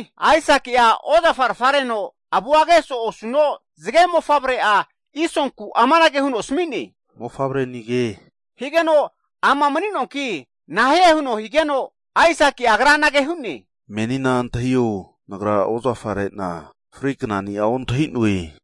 Aisaki ozafarfa regeno avumo'a osi'a asu higeno, zge mofavre'a Isonku amanage huno asmi'ne, mofavrenige higeno, Ama mani'noanki nahie huno higeno, Aisaki agra anage hu'ne, antahio menina nagra ozafarena fri knania ontahinoe.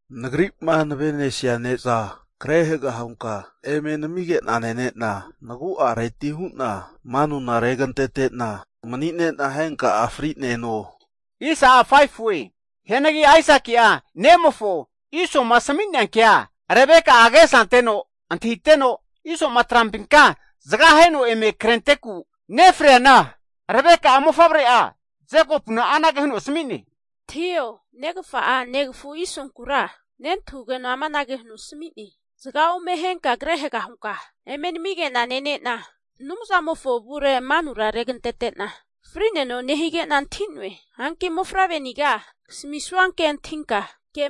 Nagri'ma navenesia ne'za kre haga hunka eme namige'na nene'na, nagu'areti manu regantete'na, mani'ne'na henka'a frineno. Rebeka'a agesa anteno antahi'ne Aisaki'a nemofo Isoma asmia kea, higeno Isoma trampinka zga aheno eme krenteku nefreana, Rebeka Jekopuna mofavre'a asmi'ne, Antahio, negfa'a negfu Isonkura nentahugeno amanage huno asmi'ne, zga ome ahenka kre haga hunka eme namige'na nene'na Anumzamofo avure manu regantete'na fri'neno, nehigena antahi'noe. Hanki mofavre'niga kasmisua kea antahio.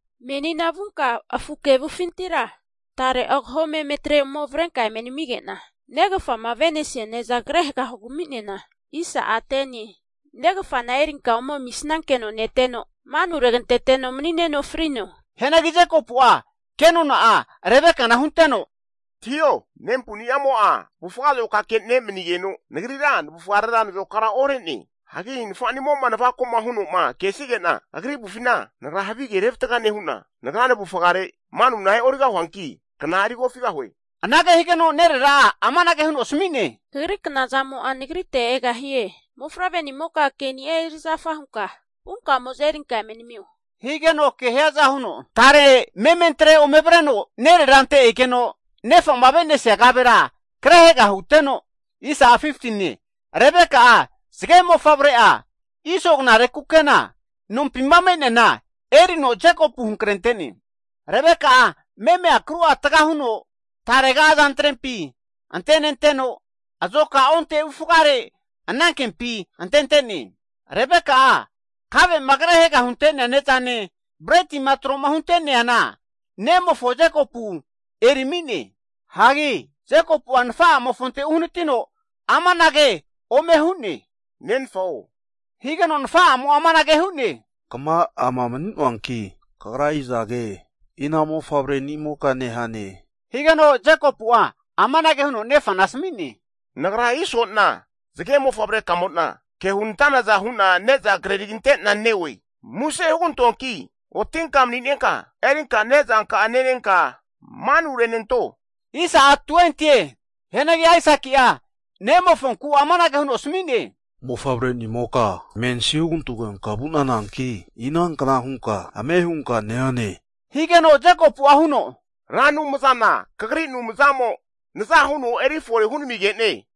Menina vunka afu kevufinti tare onensa meme avrenka eme namigena negfama avenesia ne'za kre haga hugami'nena, negfa'na erinka ome amisnankeno neteno, manu aregenteteno mani'neno frino. Hianagi Jekopu'a kenona'a Rebekana hunte'ne, Ke'nano, nempunimo'a avufga azokake ne' mani'ne, nagrira navufga nazokara ore'ne. Hu'neanagi nafanimo navakoma hunoma kesige'na agri avufina, nagra havige revatga nehuna, nagra nvufare manuna e'origahuanki, kna eri kofigahue. Anage higeno nerera'a amanage huno asmi'ne, Kagri knazamo'a nagrite egahie. Mofavre'nimoka, ke'nia erizafa hunka, vunka ome erinka eme namio. Anante ke hiaza huno tare mementre ome avreno nererante egeno nefama avenesia kavera kre haga huteno, Rebeka'a Iso zge mofavre'amofo knare kukena, nompima me'neama'a erino Jekopu hankrente'ne. Rebeka'a meme akru'a tga huno, tarega azantrempi antenenteno, azoka onte avufgare anankempi antente'ne. Kave'ma kre haga huntea ne'zane, bretima troma hunteana nemofo Jekopu ami'ne. Nfa'amofonte Jekopu uhanitino amanage huno hu'ne, Nfa'o, higeno, nfa'amo amanage hu'ne, kma ama mani'noanki, Kagra izaga, ina mofavrenimoka nehane? Jekopu nafa'amofo asmi'ne, zge mofavre kamona Nagra Isone, ke hunantanaza hu'na neza kreri'na neoe. Muse (plis) hugantoanki otinka maninenka erinka nezanka'a nenenka manurenanto. Hianagi Aisaki'a nemofonku amanage huno asmi'ne, mensi hugantogenka vu'nananki, inankna hunka ame' hunka neane, mofavre nimoka? Na'ankure Ra Anumza, kagri Anumzamo naza huno eri fore hunamige'ne.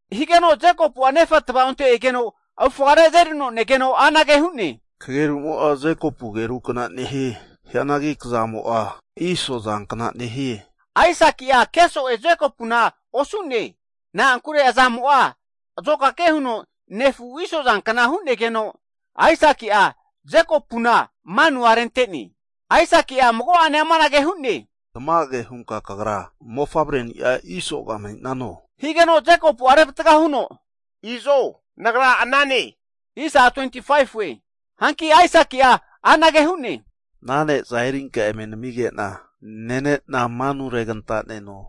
Higeno Jekopu'a nefa tva'onte egeno avufgare azerino ke'ne. Kagerumo'a Jekopu ageru kna nehie. Hanki kazamo'a Iso azankna nehie. Aisaki'a ke so'e osune, na'ankure azamo'a azokake huno nefu Iso azankna hu'negeno, Aisaki'a Jekopu manu rentene. Aisaki amanage hu'ne, Tmage hunka kagra mofavre ni'a Isoga mani'nano? higeno, Jekopu revatga huno, Izo nagra anane. Hanki ana ne'za erinka eme nmige'na nene'na manu reganta'neno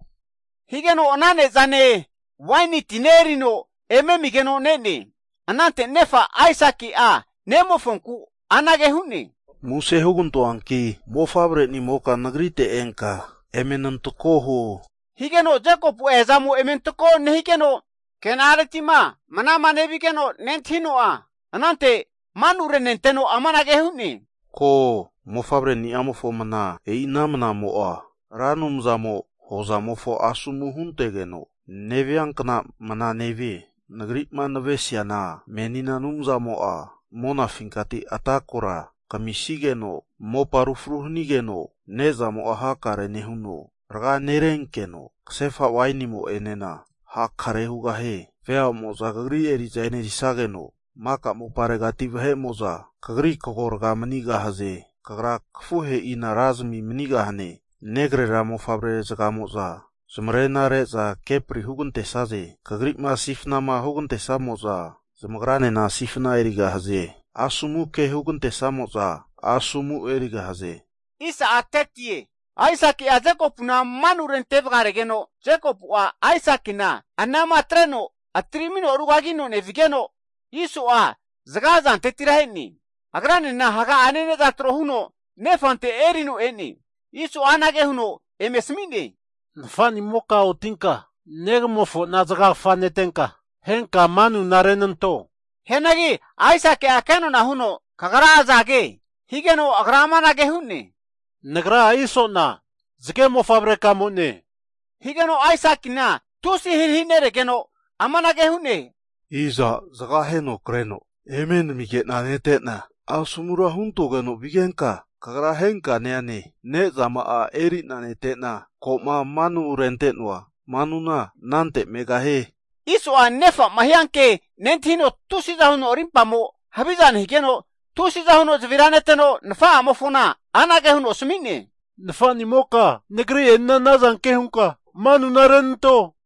higeno, Ana ne'zane, waeni tine erino eme amigeno ne'ne. Anante nefa Aisaki'a nemofonku anage hu'ne, Muse (plis) hugantoanki mofavre' nimoka nagrite enka eme nantako huo. Eazamo eme antako nehigeno, kena'aretima mna nevigeno nentahino'a, anante manu renenteno amanage hu'ne, Ko, mofavreni'amofo mna. E'i ana mnamo'a hozamofo Ra Anumzamo asomu huntegeno, nevia kna mna nevie. Nagri'ma navesiana, menina Anumzamo'a monafinkati ata' kora kamisigeno, mopa aru fru hanigeno, nezamo'a hakare nehuno, rga nerenkeno ksefa wainimo enena hakare hugahie. Veamo'za kagri eri'za enerisageno, maka moparegati vahe'mo'za zamarena reza kagrite zamagena hantgigahaze. Kagra kafuhe'ina razimi manigahane, negrera mofavre zgamoza zamarena re'za kepri hugante'saze. Kagrima sifna hugantesamo'za zamagranena sifna erigahaze, asomu hugante'samo'za, asomu erigahaze. Aisaki'a Jekopuna manu rente vgaregeno, hagi Jekopu'a Aisakina anama atreno atirmino arugagino nevigeno, Iso'a zga zantetira e'ne. Agranena haga'ane ne'za tro huno nefante erino e'ne. Iso'a anage huno asmi'ne, Nfa'nimoka otinka negamofo zgagfa netenka, henka manurenanto. Nefa Aisaki amanage huno kenona hu'ne, Kagra azage? Nagra Iso'ne, zge mofavre kamo'ne higeno, Aisakina tusi'a ahirahi neregeno amanage hu'ne, Aza' zga aheno kreno eme nmige'na nete'na, asomura huntogeno vigenka kagra henka neane? Ne'zama'a eri'na nete'na koma manu rente'noa manuna anante megahie. Iso'a nafa'amo hianke nentahino tusiza huno rimpamo haviza nehigeno, tusiza huno zavira neteno nfa'amofona asmi'ne, Nfa'nimoka! Nagri'enena ana zanke hunka manurenanto!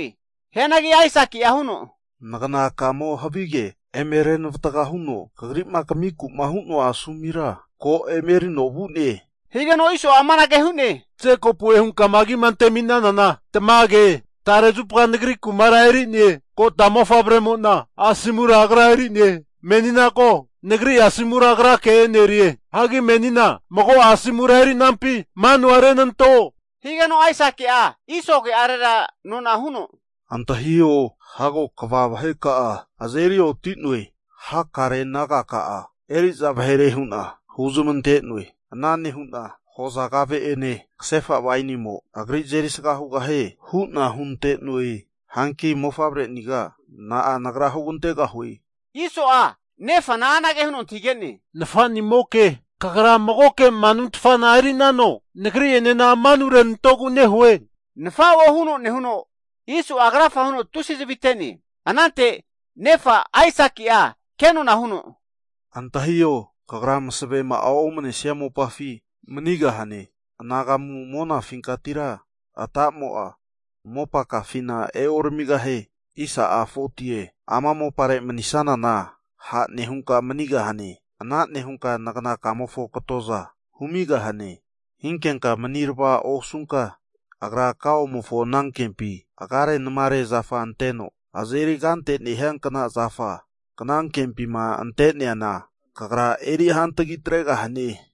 Hianagi naganakamo havige eme renavatga huno kagrima kamiku'ma hu'noa manuna ko emerino vu'ne. Iso amanage hu'ne, Jekopu'e hunka agima ante'minanana tamage, tare zupa nagri ku'ma eri'ne? Kota mofavre'mona asomura agra eri'ne, menina ko, nagri asomura agrake e'nerie. Nehuno amanage hu'ne, Menina mago'a manuni'a eri nante'nano? Higeno, Aisaki'a Iso ke'are nona hu'ne, Antahio hago kva vaheka'a azeri oti'noe, hakare naga'a eri'za vahere hu'na huzmante'noe, ana nehu'na hoza kave ene ksefa wainimo agri azeri sga hugahie. Hanki mofavre'niga, nagra na'a hugantegahue? Iso'a nefa asmi'ne, Nafanimoke, kagra magoke manutfana erinano? Nagri'ene manurenantogu nehue, nenfao huno nehuno Iso'a krafa huno tusi zvi ate'ne. Anante nefa Aisaki kenona huno asmi'ne, Antahio, kagra msavema'a omnesia mopafi manigahane. Anagamu monafinkatira, ata'mo mopakafina oramigahie. Ama mopare manisnanana ha' nehunka manigahane, ana nehunka nganakamofo katoza humigahane. Hinkenka mani rva osunka, agra kaomofo anankempi agare namare zafa anteno azeri kante nehiankna zafa knankempima ante'neana, kagra eri hantagi atregahane.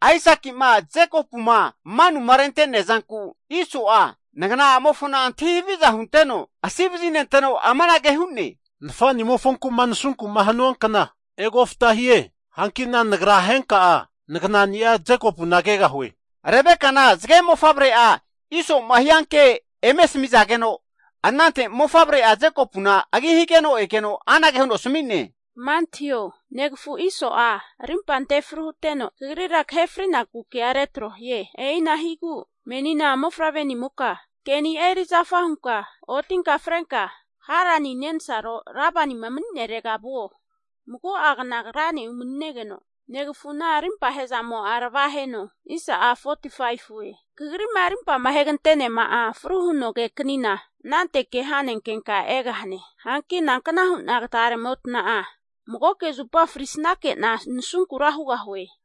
Aisaki Jekopuma manu rente'nea zanku, Iso'a nagna'a mofo antahi haviza hunteno asi vazinte'no, amanage huno hu'ne, Nafa'nimofonku'ma nasunku husua kna egofta hie, hankina henka'a nagra naganani'a Jekopuna kegahue. Zge mofavre'amo Iso'ma hianke Rebekana eme asmi'zageno, anante mofavre'a Jekopu agi higeno egeno anage huno asmi'ne, Kma antahio, negafu Iso'a rimpa antefru huteno, kagrira kahe frinaku ke retro hie. E'igu menina mofavre'nimoka keni'a erizafa hunka, otinka frenka Harani nensaro Labani nehirega vuo! Mago'a gna agrane umani'negeno, negfuna rimpa ahezamo'a ravaheno, Kagrima rimpa ahegante'neama fru huno ageknina, anante ke ha'nenkenka egahane, nankna huna tarega'motna magoke'zupa frisnake'na nasunkura hugahue?